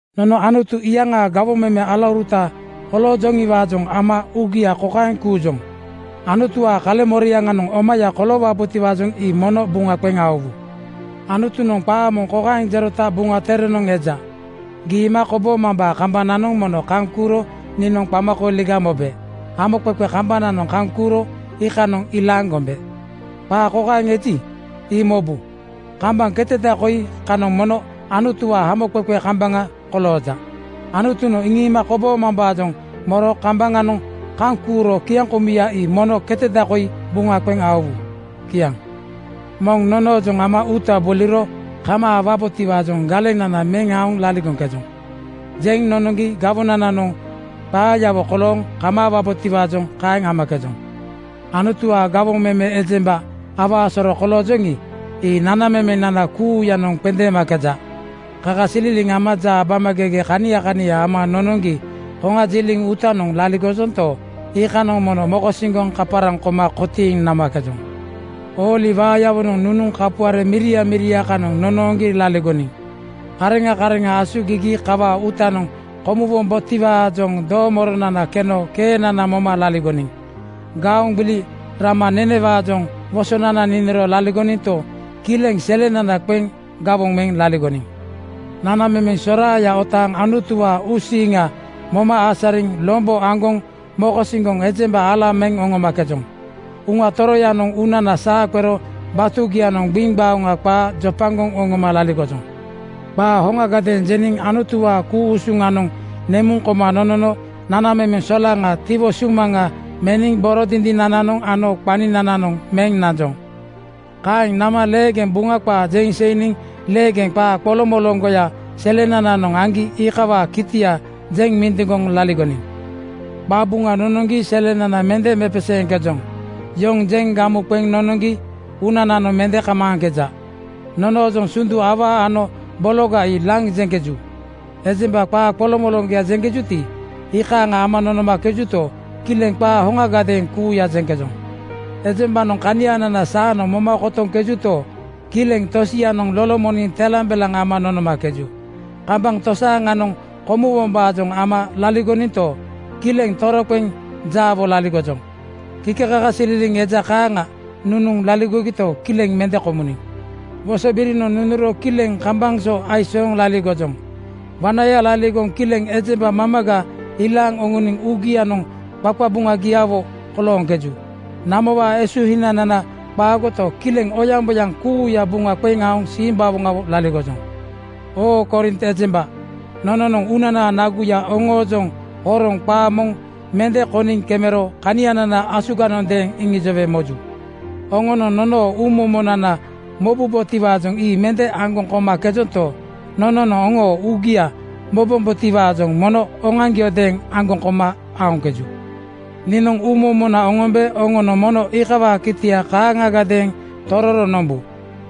Nono Anutu iyaŋaa gawoŋ meme alauruta koloojoŋiwaajoŋ ama uugia kokaeŋ kuujoŋ: Anutuwaa kaleŋmoriaŋanoŋ omaya koloowabotiwaajoŋ ii mono buŋa qeŋ aowu. Anutunoŋ qaa moŋ kokaeŋ jerota Buŋa Terenoŋ eja, “Giima koboomambaa kambananoŋ mono kaŋ kuuro niinoŋ qamakooliga mobe. Hamoqeqe kambananoŋ kaŋ kuuro iikanoŋ ilaaŋ gombe.” Qaa kaeŋ eji, ii mobu! Kambaŋ keteda koi kanoŋ mono Anutuwaa hamoqeqe kambaŋa kolooja. Anutunoŋ iŋiima koboomambaajoŋ moro kambaŋanoŋ kaŋ kuuro kiaŋkomuya ii mono keteda koi buŋa qeŋ aowu. Kiaŋ. Moŋ nonoojoŋ ama uuta boliro kamaawabotiwaajoŋ galenana meŋ aoŋ laligoŋkejoŋ. Jeŋ nonoŋgi gawonananoŋ qaayawo kolooŋ kamaawabotiwaajoŋ kaeŋ amakejoŋ. Anutuwaa gawoŋ meme ejemba awaa soro koloojoŋi, ii nanamemenana kuuyanoŋ qendeemakeja. Kakasililiŋ ama jaabamagege kania kania ama nonoŋgi koŋajiliŋ uutanoŋ laligojonto, iikanoŋ mono mokosiŋgoŋ kaparaŋ koma kotiiŋ namakejoŋ. Ooli waayawonoŋ nunuŋ kapuare miria miria kanoŋ nonooŋgi laligoniŋ. Kareŋa kareŋa asugigi kawaa uutanoŋ komuwombotiwaajoŋ doomoronana keno keenana moma laligoniŋ. Gaoŋ gbili rama nenewaajoŋ wosonana niniro laligoninto, kileŋ selenana qeŋ gawoŋ meŋ laligoniŋ. Nanamemeŋ soraaya otaaŋ Anutuwaa uusiiŋa moma asariŋ lombo aŋgoŋ mokosiŋgoŋ ejemba ala meŋ oŋomakejoŋ. Uŋa Toroyanoŋ uunana saa qero batugianoŋ gbiŋgbaoŋa qaa jopagoŋ oŋoma laligojoŋ. Qaa hoŋagadeeŋ jeniŋ Anutuwaa ku-usuŋanoŋ nemuŋ koma nonono nanamemeŋ solaŋaa tiwo sumaŋa meniŋ boro dindinananoŋ ano qaninananoŋ meŋ nanjoŋ. Kaeŋ nama leegeŋ Buŋa qaa jeŋ seiniŋ, leegeŋ qaa qoloŋmoloŋgoya selenananoŋ aŋgi iikawaa kitia jeŋ mindiŋgoŋ laligoniŋ. Qabuŋa nonoŋgi selenana mende mepeseeŋkejoŋ. Yoŋ jeŋ gamu qeŋ nonoŋgi uunananoŋ mende kamaaŋkeja. Nonoojoŋ sundu awaa ano bologa ii laŋ jeŋkeju. Ejemba qaa qoloŋmoloŋgoya jeŋkejuti, iikaaŋa ama nonomakejuto, kileŋ qaa hoŋagadeeŋ kuuya jeŋkejoŋ. Ejembanoŋ kanianana saanoŋ moma kotoŋkejuto, kileŋ tosianoŋ lolomoniŋ telambelaŋ ama nonomakeju. Kambaŋ tosaaŋanoŋ komuwombaajoŋ ama laligoninto, kileŋ toroqeŋ jaawo laligojoŋ. Kikekakasililiŋ eja kaaŋa nunuŋ laligogito, kileŋ mende komuniŋ. Wosobirinoŋ nunuro kileŋ kambaŋ so aisooŋ laligojoŋ. Wanaya laligoŋ kileŋ ejemba mamaga ilaaŋ oŋoniŋ uugianoŋ qaqabuŋagiawo kolooŋkeju. Namowaa esuhinanana qaagoto, kileŋ oyaŋboyaŋ kuuya buŋa qeŋ aoŋ simbawoŋawo laligojoŋ. Oo Korint ejemba, nononoŋ uunanaa naguya oŋoojoŋ horoŋ qaa moŋ mende koniŋ kemero kanianana asuganondeeŋ iŋijowe moju. Oŋonoŋ nonoo uumomonana mobubotiwaajoŋ ii mende aŋgoŋ komakejonto, nononoŋ oŋoo uugia mobombotiwaajoŋ mono oŋoaŋgiodeeŋ aŋgoŋ koma aoŋkeju. Niinoŋ uumomona oŋombe oŋonoŋ mono iikawaa kitia kaaŋagadeeŋ tororo nombu.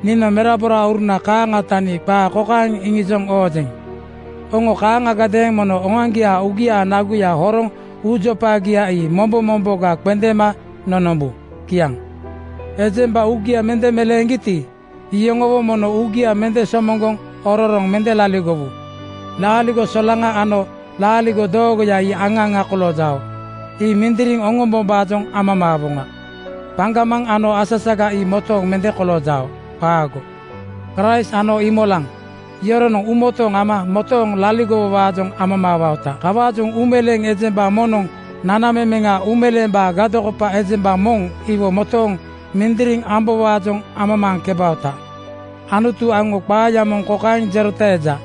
Niinoŋ meraborauruna kaaŋa tani qaa kokaeŋ iŋijoŋ oojeŋ: Oŋo kaaŋagadeeŋ mono oŋoaŋgiaa uugiaa naguya horoŋ uujopagia ii mombo momboga qendeema nonombu. Kiaŋ. Ejemba uugia mende meleeŋgiti, iyoŋowo mono uugia mende somoŋgoŋ ororoŋ mende laligowu. Laaligo solaŋa ano laaligo doogoya ii aŋa aŋa koloojao. Ii mindiriŋ orombombaajoŋ amamaawoŋa. Paŋgamaŋ ano asasaga ii motooŋ mende koloojao. Qaago! Kraist ano Iimolaŋ (Satan) yoronoŋ uumotooŋ ama motooŋ laligowowaajoŋ amamaawaota. Kawaajoŋ uumeleeŋ ejemba moŋnoŋ nanamemeŋa uumeleembaa gadokopa ejemba moŋ iwo motooŋ mindiriŋ ambowaajoŋ amamaaŋkebaota. Anutu aŋo qaaya moŋ kokaeŋ jerota eja,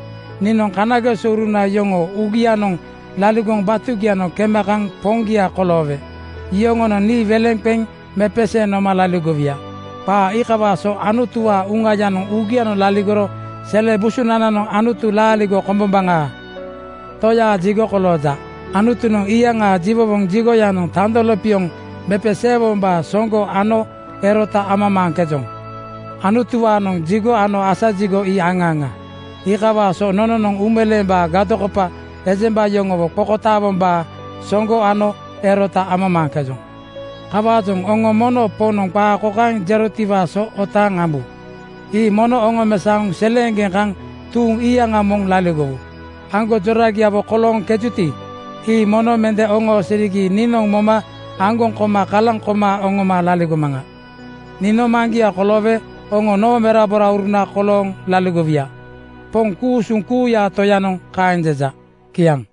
“Niinoŋ kanagesouruna yoŋoo uugianoŋ laligoŋ batugianoŋ kema kaŋ Poŋgia koloowe yoŋonoŋ nii weleŋ qeŋ mepeseeŋ noma laligowuya.” Qaa iikawaa so Anutuwaa Uŋayanoŋ uugianoŋ laligoro sele busunananoŋ Anutu laaligo kombombaŋaa Toyaa jigo kolooja. Anutunoŋ iyaŋaa jiwowoŋ jigoyanoŋ tando lopioŋ mepeseewombaa soŋgo ano erota amamaaŋkejoŋ. Anutuwaanoŋ jigo ano asa jigo ii aŋa aŋa. Iikawaa so nononoŋ uumeleembaa gadokopa ejemba yoŋowo qokotaawombaa soŋgo ano erota amamaaŋkejoŋ. Kawaajoŋ oŋo mono Poŋnoŋ qaa kokaeŋ jerotiwaa so otaaŋ ambu, “Ii mono oŋomesaoŋ seleeŋgeŋ kaŋ tuuŋ iyaŋa moŋ laligowu. Aŋgonjoragiawo kolooŋkejuti, ii mono mende oŋoosirigi niinoŋ moma aŋgoŋ koma kalaŋ koma oŋoma laligomaŋa. Niinoŋ Maŋgia koloowe oŋo noo meraborauruna kolooŋ laligowuya. Poŋ ku-usuŋ kuuyaa Toyanoŋ kaeŋ jeja.” Kiaŋ.